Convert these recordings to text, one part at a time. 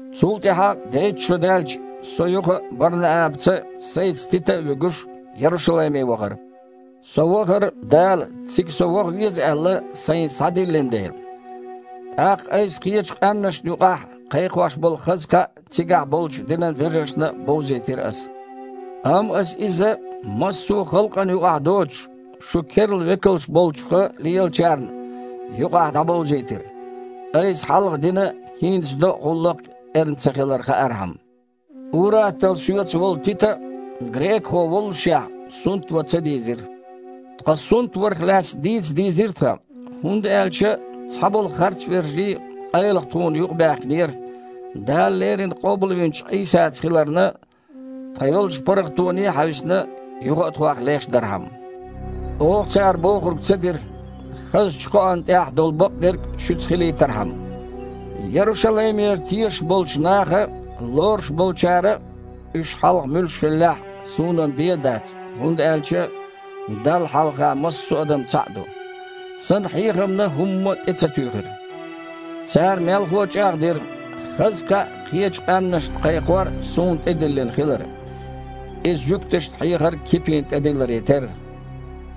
Цул тІаьхьа дейтта шо даьлча, со юха а Бар-Наабаца, сайца Тита а вуьгуш, Ярушалайме вахара. Со вахара, Дала, цига со ваха веза аьлла, сайна схьадиллина дела. ТІаккха айса кхечу къаьмнашна юкъахь кхайкхош болу хаза кхаъ цигахь болчу динан вежаршна а бовзийтира аса. Амма аса иза, массо а халкъана юкъахь доцуш, шун керла векалш болчуха лелачарна юкъахь дІабовзийтира, айса хьалха дина а, хІинца до а гІуллакх эрна ца хилар хаархьама. Ур-атталла соьца волу Тита а, грекахо воллушехь, сунтван ца дийзира. Ткъа сунтварах лаьцна дийца дийзира тхан. ХІунда аьлча цхьаболу харцвежарий къайлаха тхуна юкъабаьхкинера, Дала леррина къобалвинчу Іийсаца хиларна тхан йолчу паргІатоне а хьаьвсина, юха а тхох леш дархьама. Оха цара бохург ца дира, хазачу кхоан тІехь долу бакъдерг шуьца хилийтархьама. Ярушалаймера тешаш болчу наха лоруш болчара а (уьш хьалха муьлш хиллехь а, суна-м бен а дац, хІунда аьлча Далла хьалха массо а адам цхьаъ а ду) сан хьехамна хІумма а тІе ца туьйхира. Цара мелхо а чІагІдира, хаза кхаъ кхечу къаьмнашна кхайкхор суна тІедиллина хилар, иза жуьгташна хьехар Кипина тІедилларе терра.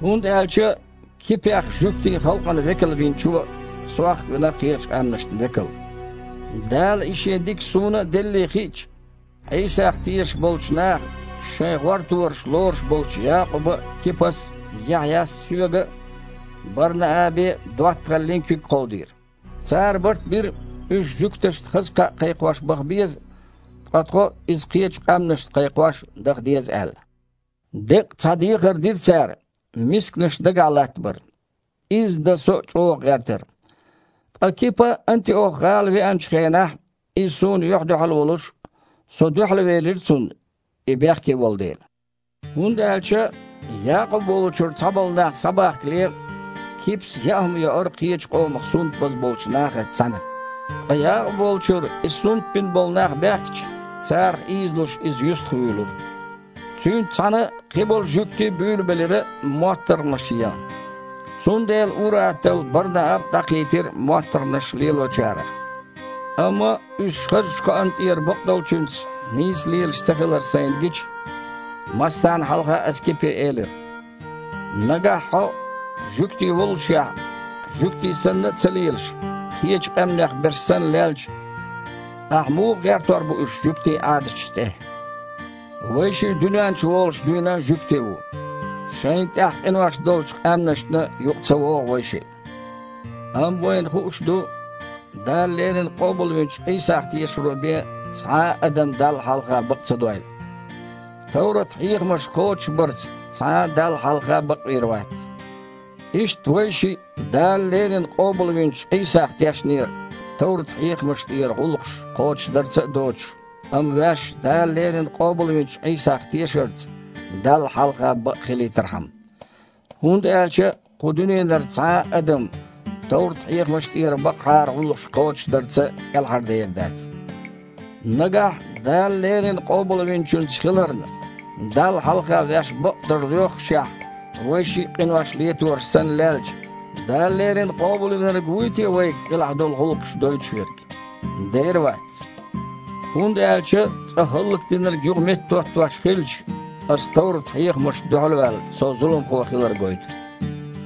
ХІунда аьлча Кипех жуьгтийн халкъана векал Винчо, сох а вина кхечу къаьмнашна векал. Дала и Шен дика суна а деллий хиъча, Іийсах тешаш болчу наха шайн гІортораш лоруш болчу Якъуба а, Кипас а, Яхьъяс а соьга а, Бар-Наабе а доттагІаллин куьг кховдийра. Цара барт бира, уьш жуьгташна хаза кхаъ кхайкхош баха беза, ткъа тхо иза кхечу къаьмнашна кхайкхош даха деза аьлла. Деккъа цхьа дехар дира цара: мисканаш дагахь латтабар. Изза дан со а чІогІа гІертара. Ткъа Кипа Антиох-гІала веанчу хенахь, иза суна юьхь-дуьхьал волуш, со дуьхьалвелира цунна, и бехке волу дела. ХІунда аьлча, Якъуб волчуьра цхьаболу нах схьабахкале, Кипас яа хІума йоура кхечу къомах сунтбаза болчу нахаца цхьаьна. Ткъа Якъуб волчуьра и сунтбина болу нах баьхкича, царах ийзалуш, иза юьстахвуьйлура. Цуьнца цхьаьна кхиболу жуьгтий а буьйлабелира моттаргІанаш ян. Цундела ур-атталла Бар-Нааба а дІакхийтира моттаргІанаш лелочарех. Амма, уьш хазачу кхоан тІера бакъдолчуьнца нийсса лелаш ца хилар сайна гича, массарна хьалха аса Кипе элира: «Нагахь хьо, жуьгти воллушехь, жуьгтий санна а ца лелаш, кхечу къаьмнех берш санна лелча, ахьа муха гІертор бу уьш жуьгтийн Іадаташ тІе? Вайшиъ дуьнен чуволуш дуьйна а жуьгти ву. Шайна тІехь къинош долчу къаьмнашна юкъа ца вогІу вайшиъ. Амма вайна хууш ду, Дала леррина къобалвинчу Іийсах тешаро бен цхьа а адам Далла хьалха бакъ ца дойла. Товрат-хьехамаш кхочушбарца цхьа а Далла хьалха бакъвийр вац. Иштта вайшиъ Дала леррина къобалвинчу Іийсах тешнера, товрат-хьехамаш тІера гІуллакхаш кхочушдарца а доцуш, амма ваьш Дала леррина къобалвинчу Іийсах тешарца Далла хьалха бакъхилийтархьама. ХІунда аьлча кху дуьненара цхьа а адам товрат-хьехамаш тІера бакъахьара гІуллакхаш кхочушдарца кІелхьардер дац. Нагахь, Дала леррина Къобалвинчуьнца хиларна, Далла хьалха ваьш бакъдар лоьххушехь вайшиъ а къинош летораш санна лелча, Дала леррина Къобалвинарг вуй те вайга къилахь долу гІуллакхаш дойтуш верг? Дера вац! ХІунда аьлча, цкъа хІаллакдинарг юха меттахІоттош хилча, аса товрат-хьехамашна дуьхьал а ваьлла, со зуламхо хилар гойту.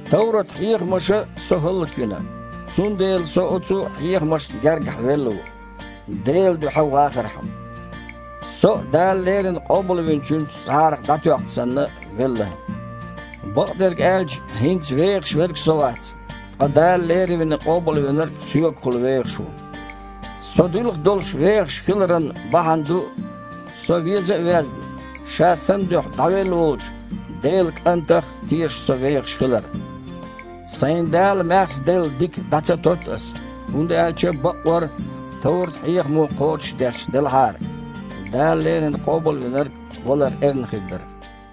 Товрат-хьехамаша со хІаллаквина, цундела со оцу хьехамашна гергахь велла ву, Делан дуьхьа вхархьама. Со а, Дала леррина Къобалвинчуьнца жІарах дІатоьхча санна, велла. Бакъдерг аьлча хІинца вехаш верг со вац, ткъа Дала леррина Къобалвинарг соьгахула вехаш ву. Со дилха долуш вехаш хиларан бахьана ду, со веза а везна, Ша сан дуьхьа дІавелла волчу Делан КІантах тешаш со вехаш хилар. Сайна Дала маьхза делла дика дІа ца тотту ас. ХІунда аьлча бакъвар товрат-хьехамо кхочушдеш делахьара, Дала леррина Къобалвинарг валар эрна хир дара!»